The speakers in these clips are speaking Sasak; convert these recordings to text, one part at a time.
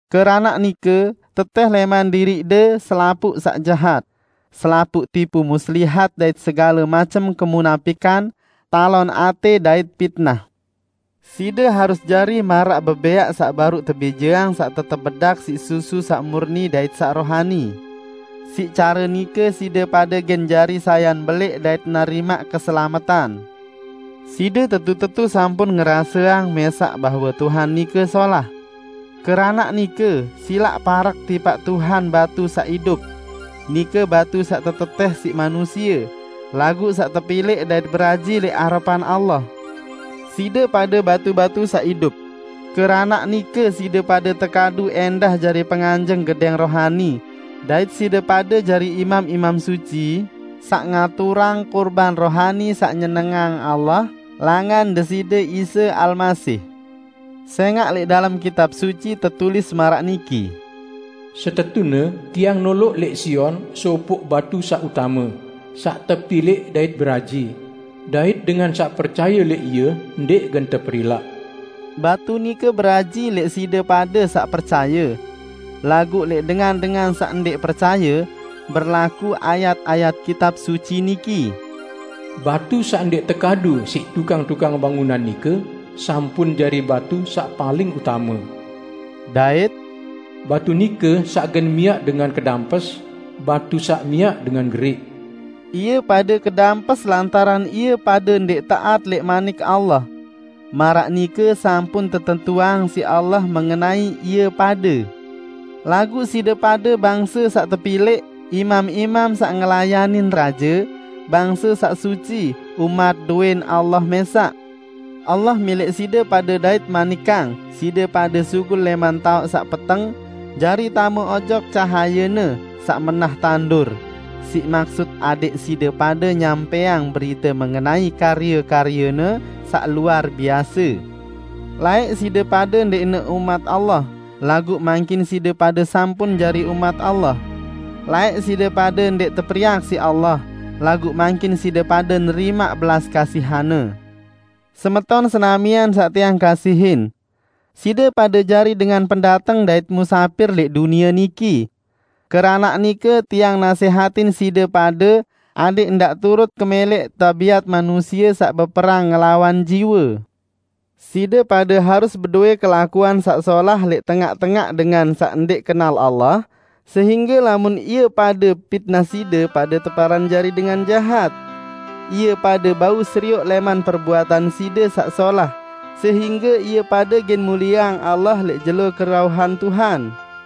Keranaq nike, tetẽh lẽman diriqde selapuq saq jahat; selapuq tipu muslihat dait segale macem kemunapikan, talon atẽ, dait pitnah. Side harus jari maraq bebẽaq saq baruq tebijeang saq tetep bedak siq susu saq murni dait saq rohani. Siq care nike side pade gen jari sayan belẽq dait nerimaq keselametan. Side tetu-tetu sampun ngeraseang mẽsaq bahwe Tuhan nike solah. Keranaq nike, silaq parek tipaq Tuhan, batu saq idup. Nike batu saq tetetẽh siq manusie, laguq saq tepilẽq dait beraji lẽq arepan Allah. Side pade batu-batu saq idup. Keranaq nike side pade tekadu ẽndah jari penganjeng gedẽng rohani, dait side pade jari imam-imam suci, saq ngaturang kurban rohani saq nyenengang Allah langan Deside Isa Almasih. Sẽngaq lẽq dalem Kitab Suci tetulis maraq niki, "Setetune Tiang noloq lẽq Sion sopoq batu saq utame, saq tepilẽq dait beraji; dait dengan saq percaye lẽq Ie ndẽq gen teperilaq." Batu nike beraji lẽq side pade saq percaye. Laguq lẽq dengan-dengan saq ndẽq percaye, berlaku ayat-ayat Kitab Suci niki, "Batu saq ndẽq tekadu siq tukang-tukang bangunan nike, sampun jari batu saq paling utame," dait, "Batu nike saq gen miaq dengan kedampes, batu saq miaq dengan geriq." Ie pade kedampes lantaran ie pade ndẽq taat lẽq Manik Allah. Maraq nike sampun tetentuang siq Allah mengenai ie pade. Laguq side pade bangse saq tepilẽq, imam-imam saq ngelayanin raje, bangse saq suci, umat dowẽn Allah mẽsaq. Allah milẽq side pade dait ngemanikang side pade sugul lẽman taoq saq peteng jari tame ojok cahaye-Ne saq menah tandur, siq maksut adẽq side pade nyampẽang berite mengenai karye-karye-Ne saq luar biase. Laẽq side pade ndẽqne umat Allah, laguq mangkin side pade sampun jari umat Allah. Laẽq side pade ndẽq teperiak siq Allah, laguq mangkin side pade nerimaq belas kasihan-Ne. Semeton senamian saq tiang kasihin! Side pade jari dengan pendateng dait musapir lẽq dunie niki. Keranaq nike tiang nasẽhatin side pade adẽq ndaq turut kemẽlẽq tabiat manusie saq beperang ngelawan jiwe. Side pade harus bedowẽ kelakuan saq solah lẽq tengaq-tengaq dengan saq ndẽq kenal Allah, sehingge lamun ie pade pitnah side pade teparan jari dengan jahat, ie pade bau serioq lẽman perbuatan side saq solah, sehingge ie pade gen mulieang Allah lẽq jelo kerauhan Tuhan.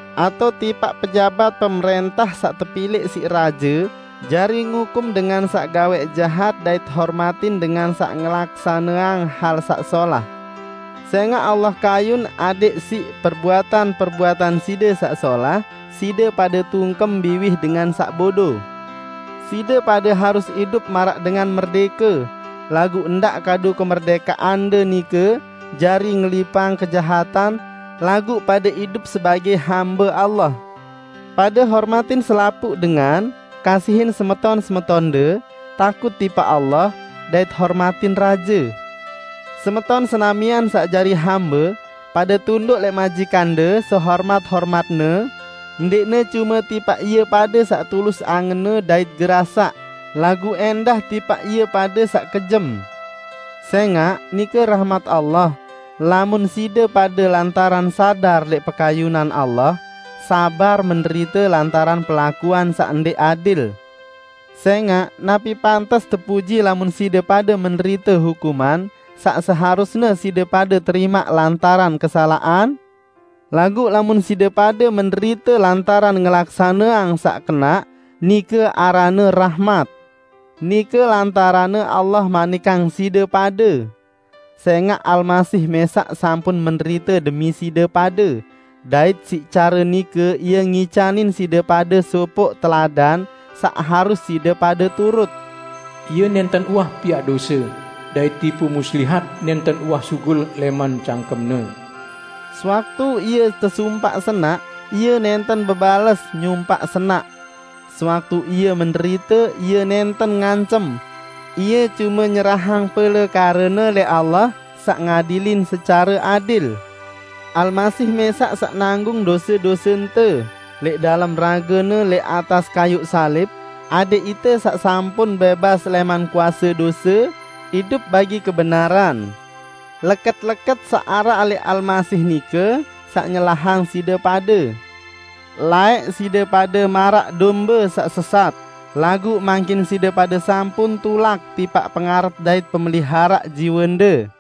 atao tipaq pejabat pemrẽntah saq tepilẽq siq raje jari ngukum dengan saq gawẽq jahat dait hormatin dengan saq ngelaksaneang hal saq solah. Sẽngaq Allah kayun adẽq siq perbuatan-perbuatan side saq solah side pade tungkem biwih dengan saq bodo. Side pade harus idup maraq dengan merdẽke, laguq ndaq kadu kemerdẽkeande nike jari ngilipang kejahatan, laguq pade idup sebagẽ hambe Allah. Pade hormatin selapuq dengan, kasihin semeton-semetonde, takut tipaq Allah, dait hormatin raje. Semeton senamian saq jari hambe, pade tunduk lẽq majikande sehormat-hormatne; ndẽqne cume tipaq ie pade saq tulus angenne dait gerasaq, laguq ẽndah tipaq ie pade saq kejem. Sẽngaq, nike rahmat Allah, lamun side pade lantaran sadar lẽq pekayunan Allah, sabar menderite lantaran perlakuan saq ndẽq adil. Sẽngaq napi pantes tepuji lamun side pade menderite hukuman saq seharusne side pade terimaq lantaran kesalaqan? Laguq lamun side pade menderite lantaran ngelaksaneang saq kenaq, nike aranne rahmat. Nike lantaranne Allah manikang side pade. Sẽngaq Almasih mẽsaq sampun menderite demi side pade, dait siq care nike Ie ngicanin side pade sopoq teladan saq harus side pade turut. Ie nẽnten uwah piaq dose, dait tipu muslihat nẽnten uwah sugul lẽman cangkem-Ne. Sewaktu Ie tesumpaq senaq, Ie nẽnten bebales nyumpaq senaq. Sewaktu Ie menderite, Ie nẽnten ngancem; Ie cume nyerahang pelekare-Ne lẽq Allah, saq ngadilin secare adil. Almasih mẽsaq saq nanggung dose-dosente lẽq dalem rage-Ne lẽq atas kayuq salib, adẽq ite saq sampun bẽbas lẽman kuase dose, idup bagi kebenaran. Leket-leket saq araq lẽq Almasih nike saq nyelahang side pade. Laẽq side pade maraq dombe saq sesat, laguq mangkin side pade sampun tulak tipaq Pengarat dait Pemeliharaq jiwende.